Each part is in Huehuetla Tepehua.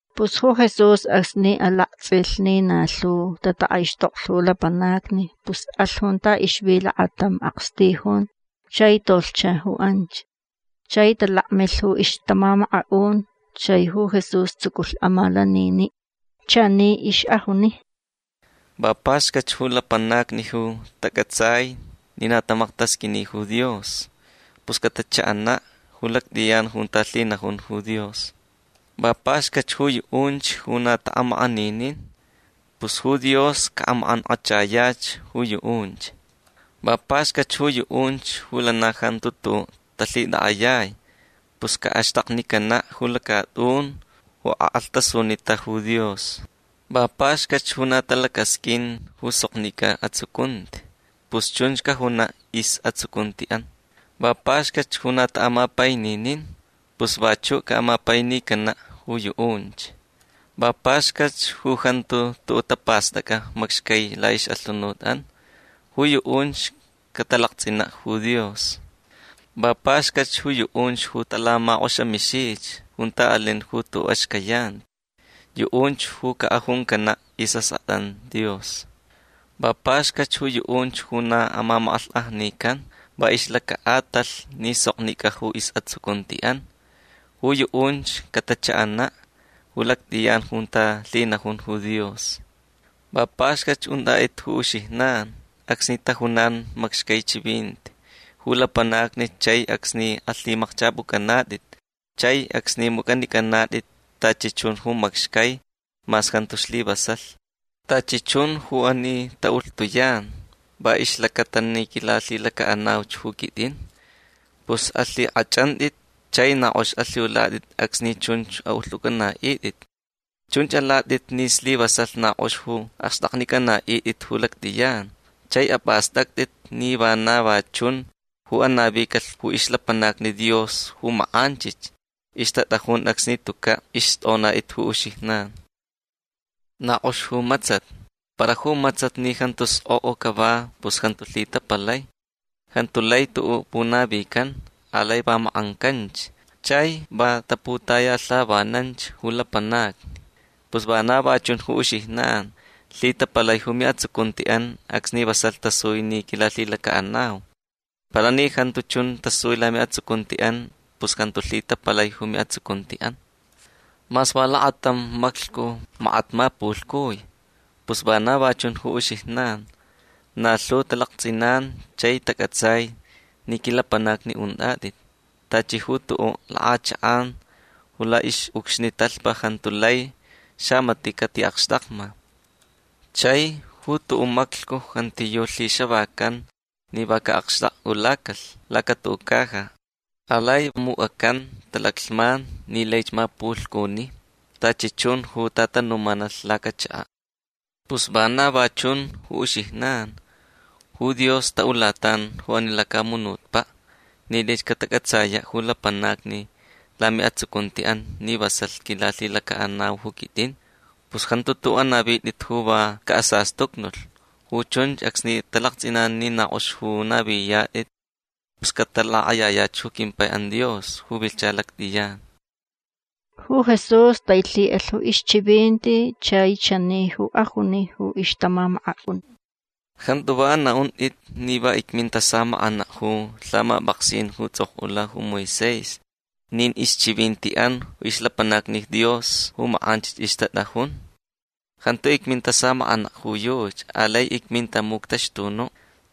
Pus ju Jesús acsni alaktsʼilh ni na lhu tatakʼaixtoklh ju lapanacni pus alh junta ixvi lakatam akstijun chai tolhcha ju anch. Chai talakmilh ju ixtamamakaʼun. Chai ju Jesús tsuculh amalaniniʼ. Chani ixʼajuni: ―Va paxcatch ju lapanacni ju tacʼatsai ni na tamaktasqʼuini ju Dios. Pus catachaʼanaʼ ju lactʼiyan junta lhinajun ju Dios. Va paxcatch ju yuʼunch ju na taʼamakʼaninin. Pus ju Dios caʼamakʼankʼachayach ju yuʼunch. Va paxcatch ju yuʼunch ju lana jantu tuʼuʼ talhitakʼayai. Pus caʼaxtaknicanaʼ ju lacatʼun ju akʼalhtasunita ju Dios. Va paxcatch ju na talacasqʼuin ju soknicʼa atsucunti. Pus chunch cajunaʼ isʼatsucuntiʼan. Va paxcatch ju na taʼamapaininin. Pus vachuʼ caʼamapainicanaʼ ju yuʼunch. Va paxcatch ju jantu tuʼuʼ tapastʼacʼa macxcai laʼixʼalhunutʼan. Ju yuʼunch catalaktsʼinaʼ ju Dios. Va paxcatch ju yuʼunch ju talamakʼoxamixich junta alin ju tuʼuʼ axcayanti. Yuʼunch ju cajuncanaʼ isʼaskʼatʼan Dios. Va paxcatch ju yuʼunch ju na amamakʼalhkʼajnican va ixlacaʼatalh ni soknicʼa ju isʼatsucuntiʼan. Ju yuʼunch catachaʼanaʼ ju lactʼiyan junta lhinajun ju Dios. Va paxcatch untʼatʼit ju uxijnan acsni tajunan macxcai chivinti ju lapanacni chai acsni alhimakchʼapʼucʼanatʼit chai acsni mucʼanicʼanatʼit tachi chun ju macxcai mas jantu slivasalh. Tachi chun ju ani taʼulhtuyan va ixlacata ni quilalhilacaʼanauch ju quitʼin. Pus alhikʼachʼantʼit chai na kʼox alhiulatʼit acsni chunch aʼulhtʼucʼanaʼitʼit. Chunch alatʼit ni slivasalh na kʼox ju axtʼaknicʼanaʼitʼit ju lactʼiyan. Chai apʼastʼactʼit ni vana va chunch ju anavicalh ju ixlapanacni Dios ju makʼanchich ixtatʼajun acsni tucaʼ ixtʼonatʼit ju uxijnan. Na kʼox ju matsat. Para ju matsat ni jantu skʼokʼo cava pus jantu lhitapalai. Jantu lai tuʼuʼ punavican. Alai va makʼancanch chai va taputayalhavananch ju lapanacni. Pus vana va chun ju uxijnan. Lhitapalai ju miʼatsucuntiʼan acsni vasalh tasui ni quilalhilacaʼanau. Para ni jantu chun tasui lamiʼatsucuntiʼan pus jantu lhitapalai ju miʼatsucuntiʼan. Mas va lakatam maclhcu makat mapulhcui. Pus vana va chun ju uxijnan. Na lhu talaktsʼinan chai tacʼatsai ni quilapanacni untʼatʼit. Tachi ju tuʼuʼ lakʼachakʼan ju laʼixʼucxni talhpa jantu lai xamatiʼ catiʼakxtakma. Chai ju tuʼuʼ maclhcu jantiyuʼ lhixavacan ni va caʼakxtakʼulacalh lacatuʼuʼ caja. Alai mucʼacan talaclhman ni laich mapulhcuni tachi chun ju tatanumanalh lacachakaʼ. Pus vana va chun ju uxijnan. Ju Dios taʼulatan ju ani lacamunutpaʼ ni laich catacʼatsayaʼ ju lapanacni lamiʼatsucuntiʼan ni vasalh quilalhilacaʼanau ju quitʼin. Pus jantu tuʼuʼ anavitʼit ju va caʼasastucnulh. Ju chunch acsni talaktsʼinan ni na kʼox ju naviyatʼit pus catalakʼayayach ju quimpaiʼan Dios ju vilhcha lactʼiyan. Ju Jesús tailhiʼalh ju ixchivinti chai chani ju ajuni ju ixtamamakaʼun: ―Jantu va anaʼuntʼit ni va icminta samakʼanaʼ ju lhamapʼaksin ju tsʼokʼula ju Moisés nin ixchivintiʼan ixlapanacni Dios ju makʼanchich ixtatʼajun. Jantu icminta samakʼanaʼ ju yuchi. Alai icminta muctaxtunuʼ.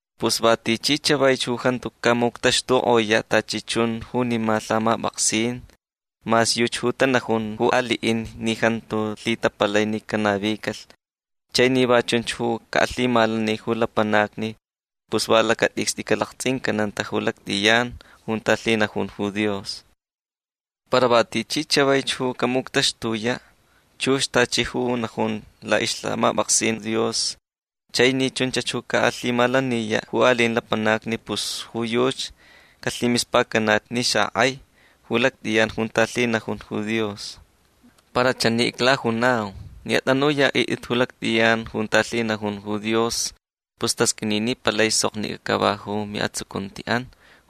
Pus va tichi chavaich ju jantu camuctaxtukʼoyaʼ tachi chun junima lhamapʼaksin mas yuchi ju tanajun ju aliʼin ni jantu lhitapalai ni canavicalh chai ni va chunch ju caʼalhimalani ju lapanacni pus va lacatʼicstʼi calaktsʼincananta ju lactʼiyan junta lhinajun ju Dios. Para va tichi chavaich ju camuctaxtuyaʼ chux tachi ju najun laʼixlhamapʼaksin Dios chai ni chunch ju caʼalhimalaniyaʼ ju aliʼin lapanacni pus ju yuchi calhimispacanach ni xakʼai ju lactʼiyan junta lhinajun ju Dios. Para chani iclajunau. Ni atʼanuyaʼitʼit ju lactʼiyan junta lhinajun ju Dios pus tasqʼuini ni palai soknicʼa cava ju miʼatsucuntiʼan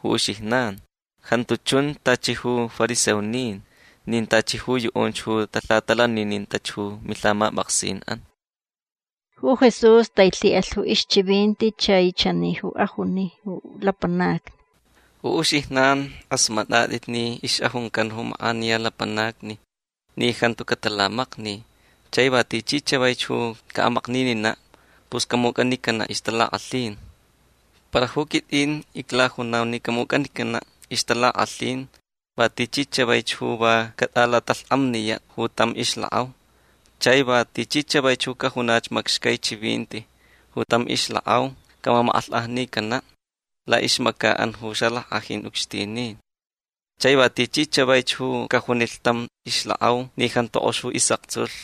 ju uxijnan. Jantu chun tachi ju fariseonin nin tachi ju yuʼunch ju talhatalaninintach ju milhamapʼaksinʼan. Ju Jesús tailhiʼalh ju ixchivinti chai chani ju ajuni ju lapanacni: ―Ju uxijnan kʼasmatʼatʼit ni ixʼajuncan ju makʼaniya lapanacni ni jantu catalamakni. Chai va tichi chavaich ju caʼamaknininaʼ pus camucʼanicanaʼ ixtalakʼalhin. Para ju quitʼin iclajunau ni camucʼanicanaʼ ixtalakʼalhin va tichi chavaich ju va catʼalatalhkʼamniyaʼ ju tam ixlakʼau. Chai va tichi chavaich ju cajunach macxcai chivinti ju tam ixlakʼau camamakʼalhkʼajnicanaʼ laʼixmacaʼan ju xalackʼajin ucxtinin. Chai va tichi chavaich ju cajunilh tam ixlakʼau ni jantu kʼox ju isʼaktsulh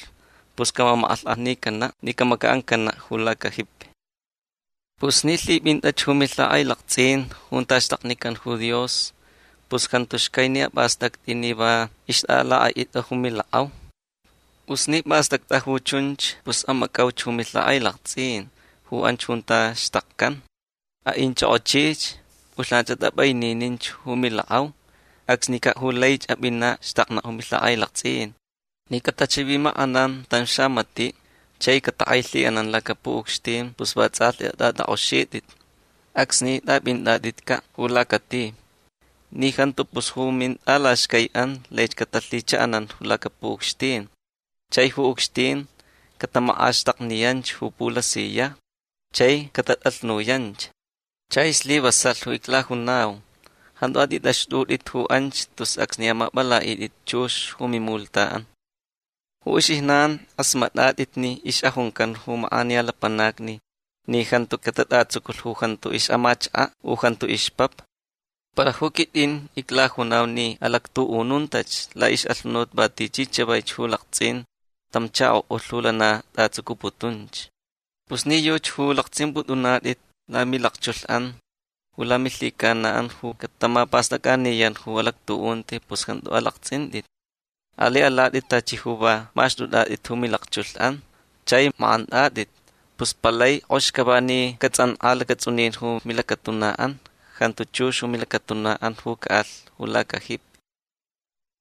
pus camamakʼalhkʼajnicanaʼ ni camacaʼancanaʼ ju lacajipi. Pus ni lhipʼintʼach ju milhakʼailaktsʼin junta xtaknican ju Dios pus jantu xcai ni apʼastʼactʼi ni va ixtʼalakʼaʼitʼa ju milakʼau. Pus ni pʼastʼactʼa ju chunch pus amacʼauch ju milhakʼailaktsʼin ju anch junta xtakcan. Aʼinchʼokʼochich. Pʼulhnan atʼapʼaininich ju milakʼau. Acsnicaʼ ju laich apʼinaʼ xtaknaʼ ju milhakʼailaktsʼin. Ni catachivimakʼanan tam xamatiʼ chai catakʼailhiʼanan lacapuʼucxtin pus vatsʼalhti atʼatʼakʼoxitʼit acsni tʼapʼintʼatʼitcaʼ ju lacati. Ni jantu pus ju mintʼalaxcaiʼan laich catalhichaʼanan lacapuʼucxtin. Chai ju ucxtin catamakʼaxtakniyanch ju pulasiyajni chai catatʼalhnuyanch. Chai slivasalh ju iclajunau. Jantu atʼitʼaxtʼutʼit ju anch tus acsni amapʼalaʼitʼit chux ju mimulhtaʼan. Ju uxijnan kʼasmatʼatʼit ni ixʼajuncan ju makʼaniya lapanacni ni jantu catatʼatsuculh ju jantu ixʼamachakaʼ u jantu ixpapa. Para ju quitʼin iclajunau ni alactuʼununtach laʼixʼalhunut va tichi chavaich ju laktsʼin tam chakoʼulh ju lana tʼatsucuputunch. Pus ni yuchi ju laktsʼimpʼutʼunatʼit lamilakchulhʼan ju lamilhicanaʼan ju catamapastʼacʼaniyan ju alactuʼunti pus jantu alaktsʼintʼit. Alai alatʼit tachi ju va maxtʼutʼatʼit ju milakchulhʼan chai makʼantʼatʼit. Pus palai kʼox cava ni catsʼankʼa lacatsʼunin ju milacatunaʼan. Jantu chux ju milacatunaʼan ju caʼalh ju lacajipi.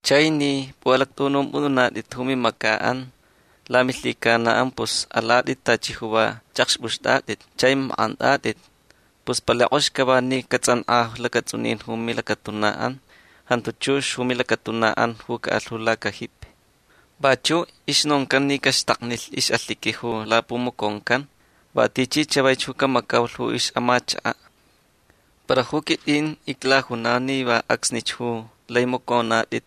Chai ni pʼuʼalactʼuʼunumpʼutʼunatʼit ju mimacaʼan lamilhicanaʼan pus alatʼit tachi ju va chʼakxpʼuxtʼatʼit chai makʼantʼatʼit. Pus palai kʼox cava ni catsʼankʼa lacatsʼunin ju milacatunaʼan. Jantu chux ju milacatunaʼan ju caʼalh ju lacajipi. Vachuʼ ixnoncan ni caxtaknilh ixʼalhiqui ju lapumaconcan va tichi chavaich ju camacaulh ju ixʼamachakaʼ. Para ju quitʼin iclajunau ni va acsnich ju lai macʼonatʼit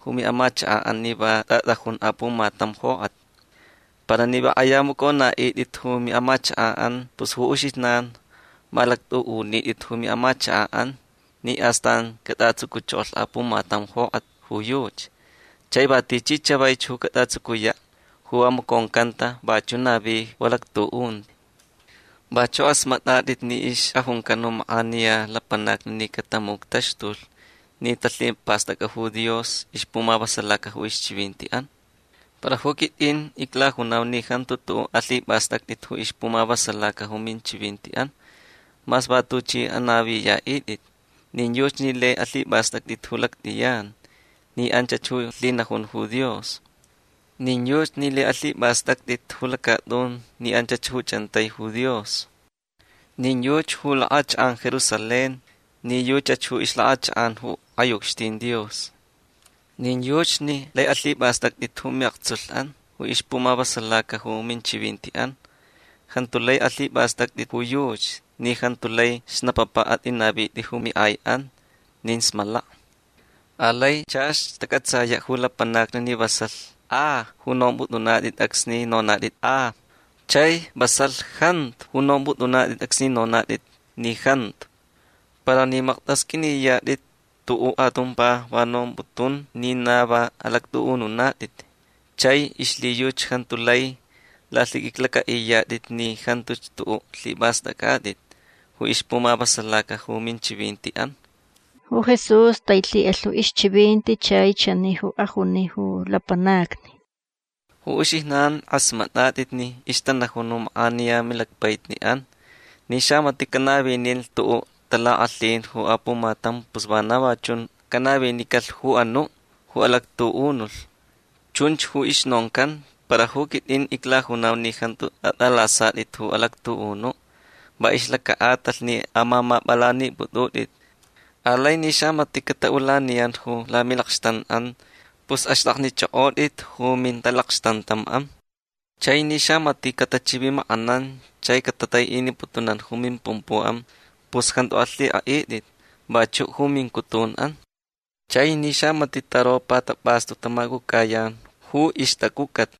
ju miʼamachakaʼan ni va tʼatʼajun apumatam jokʼat. Para ni va kʼaya amacʼonaʼitʼit ju miʼamachakaʼan pus uxijnan ju malactʼuʼunitʼit ju miʼamachakaʼan ni astan catʼatsuculh apumatam jokʼat ju yuchi. Chai va tichi chavaich ju catʼatsucuyaʼ ju va maconcanta vachuʼ navi ju alactuʼunti. Vachuʼ kʼasmatʼatʼit ni ixʼajuncan ju makʼaniya lapanacni ni catamuctaxtulh ni talhipastacta ju Dios ixpumavasalaca ju ixchivintiʼan. Para ju quitʼin iclajunau ni jantu tuʼuʼ alhipʼastʼactʼit ju ixpumavasalaca ju minchivintiʼan mas va tuchʼi anaviyaʼitʼit. Nin yuchi ni lai alhipʼastʼactʼit ju lactʼiyan ni anchach ju lhinajun ju Dios. Nin yuchi ni lai alhipʼastʼactʼit ju lacatʼun ni anchach ju chʼantai ju Dios. Nin yuchi ju lakʼachakʼan Jerusalén ni yuchach ixlakʼachakʼan ju kʼai ucxtin Dios. Nin yuchi ni lai alhipʼastʼactʼit ju miʼaktsulhʼan ju ixpumavasalaca ju minchivintiʼan. Jantu lai alhipʼastʼactʼit ju yuchi ni jantu lai xnapapa atʼinavitʼit ju miʼaiʼan nin smalaka. Alai chach tacʼatsayaʼ ju lapanacni ni vasalh a ju nompʼutʼunatʼit acsni nonatʼit a. Chai vasalh jantu ju nompʼutʼunatʼit acsni nonatʼit ni jantu. Para ni maktʼasqʼuiniyatʼit tuʼuʼ atumpa va nomputun ni na va alactʼuʼununatʼit chai ixlhiyuchi jantu lai lalhiqʼuiclacʼaʼiyatʼit ni jantuch tuʼuʼ lhipʼastʼacʼatʼit ju ixpumavasalaca ju minchivintiʼan. Ju Jesús tailhiʼalh ju ixchivinti chai chani ju ajuni ju lapanacni: ―Ju uxijnan kʼasmatʼatʼit ni ixtanajun ju makʼaniya milacpaʼitniʼan ni xamatiʼ canavinilh tuʼuʼ talakʼalhin ju apumatam pus vana va chunch canavinicalh ju anuʼ ju alactuʼunulh. Chunch ju ixnoncan. Para ju quitʼin iclajunau ni jantu atʼalasatʼit ju alactuʼunuʼ va ixlacaʼatalh ni amamapʼalanipʼutʼutʼit. Alai ni xamatiʼ cataʼulaniyan ju lamilakxtanʼan pus axtʼaknichʼokʼotʼit ju mintalakxtantamʼan. Chai ni xamatiʼ catachivimakʼanan chai catataiʼiniputunan ju mimpumpuʼan pus jantu alhikʼaʼitʼit vachuʼ ju mincutunʼan. Chai ni xamatiʼ taropa tapʼastu tamacʼucʼayan ju ixtacʼucʼat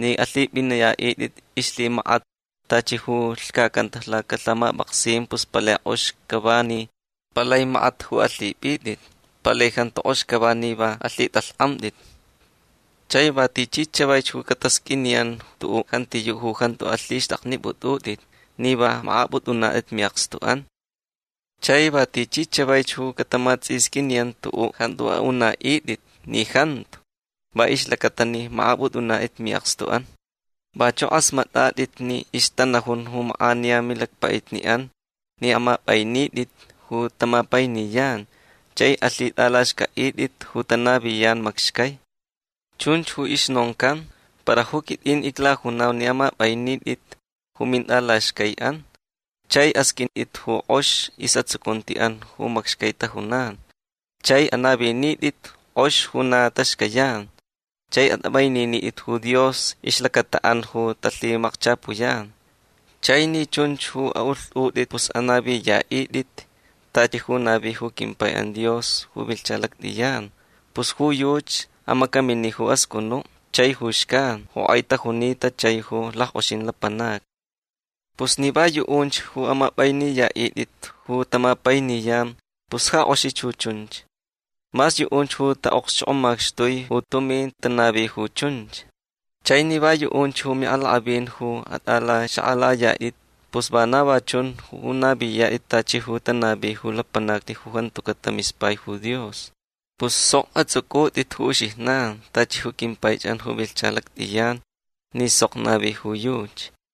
ni alhipʼiniyaʼitʼit ixlhimakat tachi ju lhcacanta lacalhamapʼaksin pus palai kʼox cava ni palai makat ju alhipʼitʼit. Palai jantu kʼox cava ni va alhitʼalhkʼamtʼit. Chai va tichi chavaich ju catasqʼuiniyan tuʼuʼ jantiyuʼ ju jantu alhixtʼaknipʼutʼutʼit ni va makʼapʼutʼunatʼit miʼakstuʼan. Chai va tichi chavaich ju catamatsʼisqʼuiniyan tuʼuʼ jantu aʼunaʼitʼit ni jantu va ixlacata ni makʼapʼutʼunatʼit miʼakstuʼan. Vachuʼ kʼasmatʼatʼit ni ixtanajun ju makʼaniya milacpaʼitniʼan ni amapʼainitʼit ju tamapainiyan chai alhitʼalaxcʼaʼitʼit ju tanaviyan macxcai. Chunch ju ixnoncan. Para ju quitʼin iclajunau ni amapʼainitʼit ju mintʼalaxcaiʼan chai asqʼuintʼit ju kʼox isʼatsucuntiʼan ju macxcai tajunan. Chai anavinitʼit kʼox ju na taxcayan. Chai atʼapʼaininitʼit ju Dios ixlacataʼan ju talhimakchapuyan. Chai ni chunch ju aʼulhtʼutʼit pus anaviyaʼitʼit tachi ju navi ju quimpaiʼan Dios ju vilhcha lactʼiyan. Pus ju yuchi amacamini ju ascʼunuʼ chai ju xcan ju kʼai tajunita chai ju lackʼoxin lapanacni. Pus ni va yuʼunch ju amapʼainiyaʼitʼit ju tamapainiyan pus ja kʼoxich ju chunch. Mas yuʼunch ju taʼokxchokʼomaxtui ju tumin tanavi ju chunch. Chai ni va yuʼunch ju miʼalakʼavin ju atʼalaxakʼalayatʼit pus vana va chunch ju naviyatʼit tachi ju tanavi ju lapanacni ju jantucaʼ tamispai ju Dios. Pus sok atsʼucʼutʼit ju uxijnan tachi ju quimpaichʼan ju vilhcha lactʼiyan ni sok navi ju yuchi.